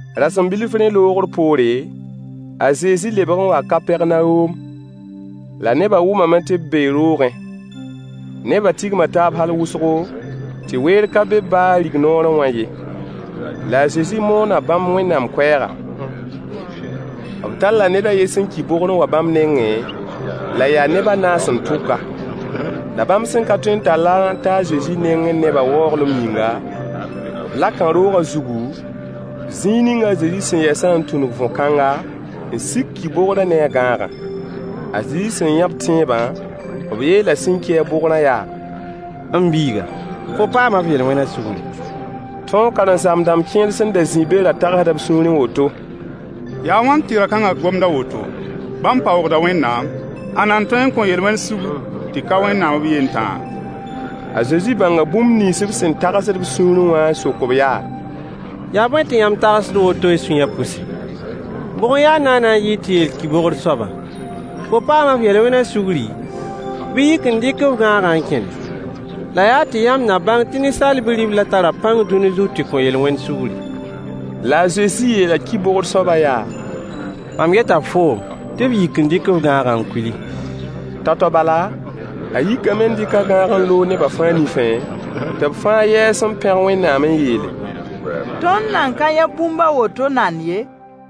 Rasem bilf rẽ loogr poore, a Zezi lebg n waa Kapɛrnawom, la nebã wʋmame tɩ b bee roogẽ. Nebã tigma taab hal wʋsgo, tɩ weer ka be baa rig-noorẽ wã ye. La a Zezi moona bãmb Wẽnnaam koɛɛga. B talla ned a yen sẽn ki bogr n wa bãmb nengẽ, la yaa neb a naas n tʋk-a. La bãmb sẽn ka tõe n tall-a n ta a Zezi nengẽ neba waooglem yĩngã, b laka roogã zugu, zĩig ning a Zezi sẽn yɛsã n tũnug võ-kãnga n sik ki-bogrã ne a gãagã. A Zezi sẽn yã b tẽebã, b yeela sẽn ki-a bogrã yaa: M biiga, fo paama f yel-wẽna sugri. Tõog karen-saam-dãmb kẽer sẽn da zĩ be ra tagsda b sũurẽ woto: Yaa a wãn tɩ ra-kãnga gomd a woto? Bãmb paoogda Wẽnnaam. Ãnna n tõe n kõ yel-wẽn sugr tɩ ka Wẽnnaam b yen tãa? A Zezi bãnga bũmb nins b sẽn tagsd b sũurẽ wã n sok-b yaa: Yaa bõe tɩ yãmb tagsd woto y sũyã pʋse? Bʋg n ya naana n yɩɩd tɩ yeel ki-bogr soabã: Fo paama f yel-wẽna sugri, bɩ yik n dɩk f gãagã n kẽne? La yaa tɩ yãmb na bãng tɩ Ninsaal Bi-riblã tara pãng dũni zug tɩ kõ yel-wẽn sugri. La a Zezi yeela ki-bogr soabã yaa: Mam yeta foom tɩ f yik n dɩk f gãagã n kuili. Tao-tao bala, a yikame n dɩk a gãagã n loog nebã fãa nifẽ, tɩ b fãa yɛɛs n pẽg Wẽnnaam n yeele: Tõnd nan ka yã bũmb a woto nand ye.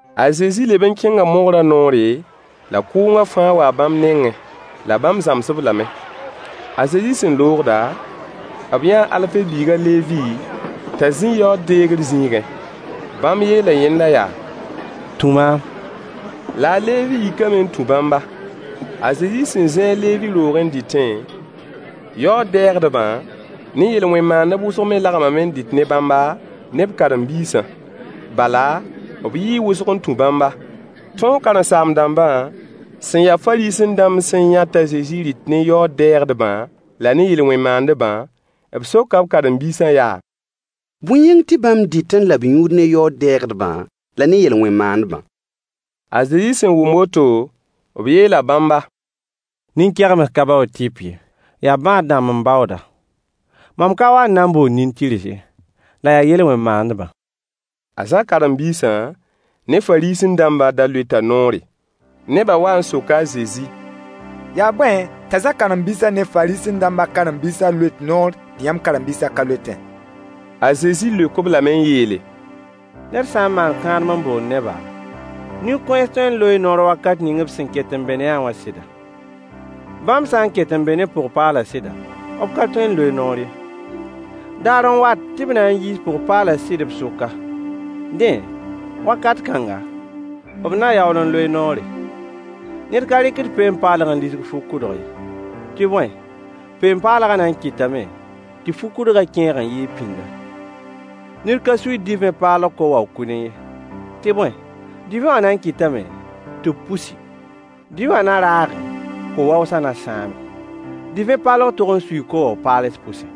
A Zezi leb n kẽnga mogrã noore, la kʋʋngã fãa waa bãmb nengẽ. La bãmb zãms-b lame. A Zezi sẽn loogda, b yãa a Alfe biig a Levi t'a zĩ yaood-deegr zĩigẽ. Bãmb yeela yẽnda yaa: Tũ maam. La a Levi yikame n tũ bãmba. A Zezi sẽn zĩ a Levi roogẽ n dɩtẽ, yaood-dɛɛgdbã ne yel-wẽn maandb wʋsg me lagmame n dɩt ne bãmba, ne b karen-biisã. Bala, b yɩɩ wʋsg n tũ bãmba. Tõog karen-saam-dãmbã sẽn ya Fariisẽ-dãmb sẽn yã t'a Zezi rɩt ne yaood-dɛɛgdbã la ne yel-wẽn maandbã, b soka b karen-biisã yaa: Bõe yĩng tɩ bãmb dɩt la b yũud ne yaood-dɛɛgdbã la ne yel-wẽn maandbã? A Zezi sẽn wʋm woto, b yeela bãmba: Nin-kegems ka baood tɩp ye, yaa bãad-dãmb n baooda. Mam ka wa n na n bool nin-tɩrs ye, la yaa yel-wẽn maandbã. A Zã karen-biisã ne Fariisẽ-dãmbã da loeta noore. Nebã wa n soka a Zezi: Yaa bõe t'a Zã karen-biisã ne Fariisẽ-dãmbã karen-biisã loet noor tɩ yãmb karen-biisã ka loetẽ? A Zezi leok-b lame n yeele: Ned sã n maan kãadem n bool neba, nin-kõens tõee n loee noor wakat ning b sẽn ket n be ne-a wã sɩda? Bãmb sã n ket n be ne pʋg-paalã sɩda, b ka tõe n loe noor ye. Daar n wat tɩ b na n yiis pʋg-paalã sɩdã b sʋka. Dẽ, wakat kãnga, b na yaool n loe noore. Ned ka rɩkd peen-paalg n lisg fu-kʋdg ye, tɩ bõe, peen-paalgã na n kɩtame tɩ fu-kʋdgã kẽeg n yɩɩg pĩnda. Ned ka suiid divẽ paalg ko-wao-kʋdẽ ye, tɩ bõe, divẽ wã na n kɩtame tɩ b pusi: Divẽ wã na raage, ko-waoosã na sãame. Divẽ paalg tog n suii ko-wao-paals pʋse.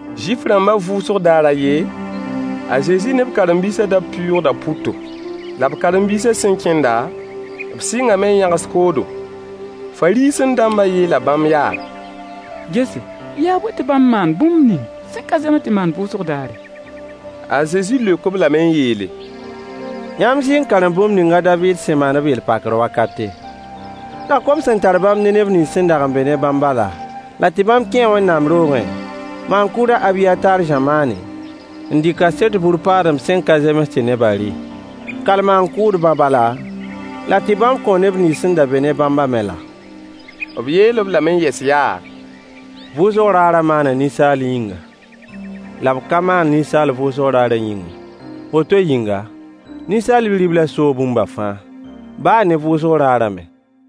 Zuif-rãmbã vʋʋsg daar a yen, a Zezi ne b karen-biisã da pɩʋʋgda pʋto, la b karen-biisã sẽn kẽndã, b sɩngame n yãgs koodo. Fariisẽ-dãmbã yeela bãmb yaa: Gese, yaa bõe tɩ bãmb maand bũmb ning sẽn ka zems tɩ maan vʋʋsg daare? A Zezi leok-b lame n yeele: Yãmb zɩ n karem bũmb ning a Daviid sẽn maan b yel-pakr wakate, la kom sẽn tar bãmb ne neb nins sẽn dag n be ne bãmbã laa? La tɩ bãmb kẽe Wẽnnaam roogẽ, maan-kʋʋd a Abiyataar zamaanẽ, n dɩ kaset bur-paadem sẽn ka zems tɩ neba rɩ, kal maan-kʋʋdbã bala, la tɩ bãmb kõo neb nins sẽn da be ne bãmbã me laa? B yeel-b lame yɛs yaa: Vʋʋsg raarã maana ninsaal yĩnga, la b ka maan ninsaal vʋʋsg daarã yĩng ye. Woto yĩnga, Ninsaal Bi-riblã soo bũmba fãa, baa ne vʋʋsg daarã me.